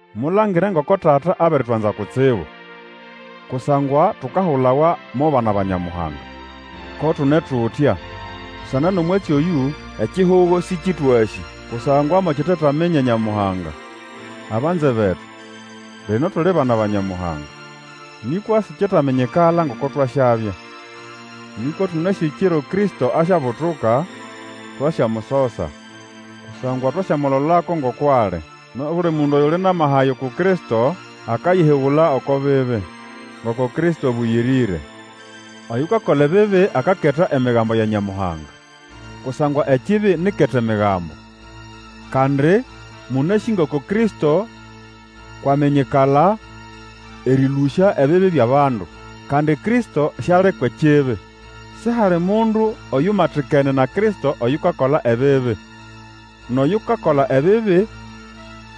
Mulangire ngoko Tata abiritwanza kutsibu, kusangwa tukahulawa mo bana ba Nyamuhanga; ko tune tutya. Busana nʼomwatsi oyũ; ekihugo sĩkĩtwasĩ, kusangwa mokitetaminya Nyamuhanga. Abanze betu, lino tuli bana ba Nyamuhanga, nĩkwa sikyetaminyikala ngoko twasyabya. Nĩkwa tũnasĩ ekiro Kristo asyabutuka, twasyamusosa, kusangwa twasyamulolako ngoko ali. Nʼobuli mundu oyuli nʼamaha aya uku Kristo, akayihigula oko bibi, ngoko Kristo abũyĩrĩre. Oyukakola ebibi akaketa Emigambo ya Nyamuhanga. Kusangwa ekibi ni ʼketa Emigambo. Kandi mũnasĩ ngoko Kristo kwʼaminyikala erĩlũsya ebibi byʼabandu; kandi Kristo siali kwʼekibi. Sihali mundu oyumatikene na Kristo oyukakola ebibi. Nʼoyukakola ebibi,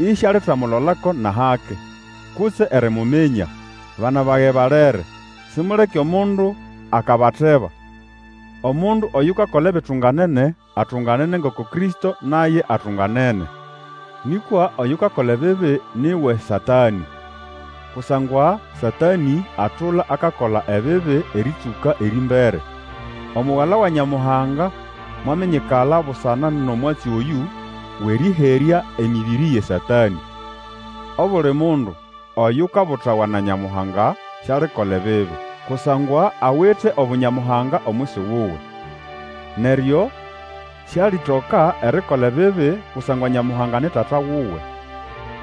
isialitamulolako nʼahake, kutse erimuminya. Bana bage balere, simuleke omundu akabateba. Omundu oyukakola ebitunganene, atunganene ngoko Kristo naye atunganene. Nĩkwa oyukakola ebibi ni wʼeSatanĩ, kusangwa Satanĩ atula akakola ebibi erĩtsũka erĩmbere. Omugala wa Nyamuhanga mwaminyikala busana nʼomwatsi oyũ wʼerĩherya emĩbĩrĩ yʼeSatanĩ. Obuli mundu Oyukabutawa na Nyamuhanga sialikola ebibi, kusangwa awite obu Nyamuhanga omwisi wuwe; neryo sialitoka erikola ebibi, kusangwa Nyamuhanga ni Tata wuwe.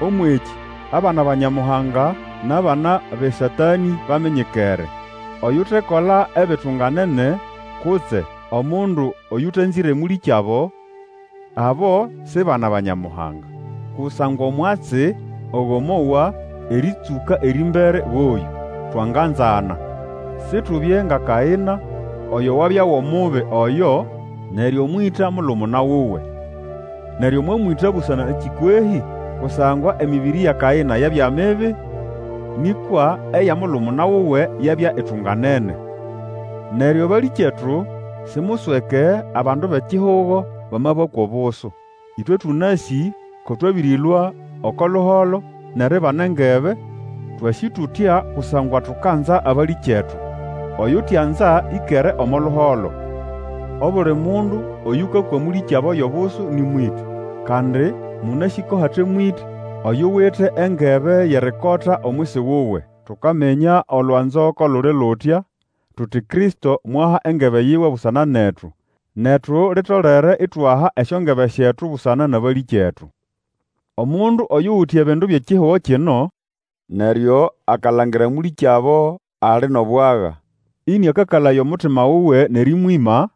Ũmwʼekĩ abana ba Nyamuhanga nʼabana bʼeSatanĩ baminyikere. Oyutekola ebitunganene, kutse omundu Oyũtanzĩre mũlĩkyabo, abo si bana ba Nyamuhanga! Kusangwa omwatsi ogo mwowa erĩtsũka erĩmbere goyũ: Twanganzana. Situbye nga Kaĩna, oyo wabya wʼOmubi Oyo, neryo mwĩta mulumuna wuwe. Neryo mwamwĩta busana nakĩ kwehĩ? Kusangwa emĩbĩrĩ ya Kaĩna yabya mibi, nĩkwa eya mulumuna wuwe yabya itunganene. Neryo balĩkyetu, simusweke abandu bʼekihugo bamabakwa obusu. Ĩtwe tũnasĩ ko twabĩrĩlũa oko luholo, nʼeribana engebe, twasĩ tutya kusangwa tukanza abalĩkyetu. Oyutianza ĩkere omo luholo. Obuli mundu Oyũkakwa mũlĩkyabo yʼobusu nĩ mwĩtĩ, kandi mũnasĩ ko hate mwĩtĩ oyuwite engebe yʼerikota omwisi wuwe. Tukaminya olwanzo ko luli lutya, tuti Kristo mwaha engebe yiwe busana netu. Netu litolere itwaha esyongebe syetu busana nʼabalĩkyetu. Omundu oyuwite ebindu byʼekihugo kino, neryo akalangira mũlĩkyabo ali nʼobwaga, ĩnĩakakalaya omutima wuwe nʼerĩmwĩma,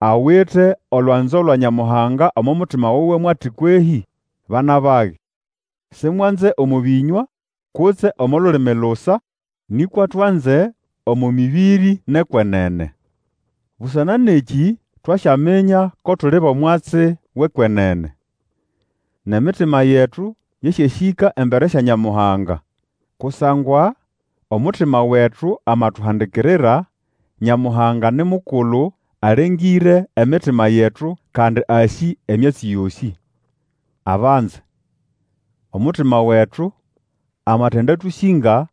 awite olwanzo lwa Nyamuhanga omo mutima wuwe mo ati kwehĩ? Bana bage, simwanze omo bĩnywa kutse omo lulimi lusa, nĩkwa twanze omo mĩbĩrĩ nʼekwenene. Busana nʼekĩ twasyaminya ko tuli bʼomwatsi wʼekwenene, nʼemitima yetu yasyasĩka embere sya Nyamuhanga. Kusangwa omutima wetu amatuhandikirira, Nyamuhanga ni mukulu, alengĩre emitima yetu, kandi asĩ emyatsi yosĩ. Abanze, omutima wetu amatindatũsĩnga,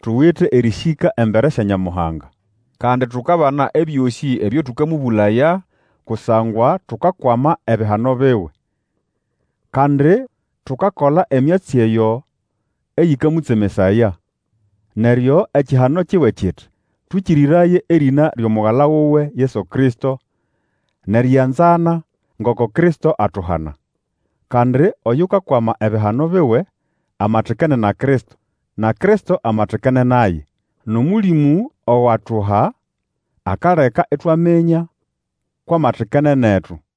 tuwite erĩsĩka embere sya Nyamuhanga. Kandi tukabana ebyosĩ ebyo tũkamũbũlaya, kusangwa tukakwama ebihano biwe, kandi tukakola emyatsi eyo eyĩkamũtsemesaya. Neryo ekihano kiwe kiti twĩkĩrĩraye erĩna lyʼomugala wuwe Yesu Kristo, nʼerianzana, ngoko Kristo atuhana. Kandi oyukakwama ebihano biwe, amatikene na Kristo, na Kristo amatikene naye. NʼOmũlĩmũ ogo atuha akaleka itwaminya kwʼamatikene netu.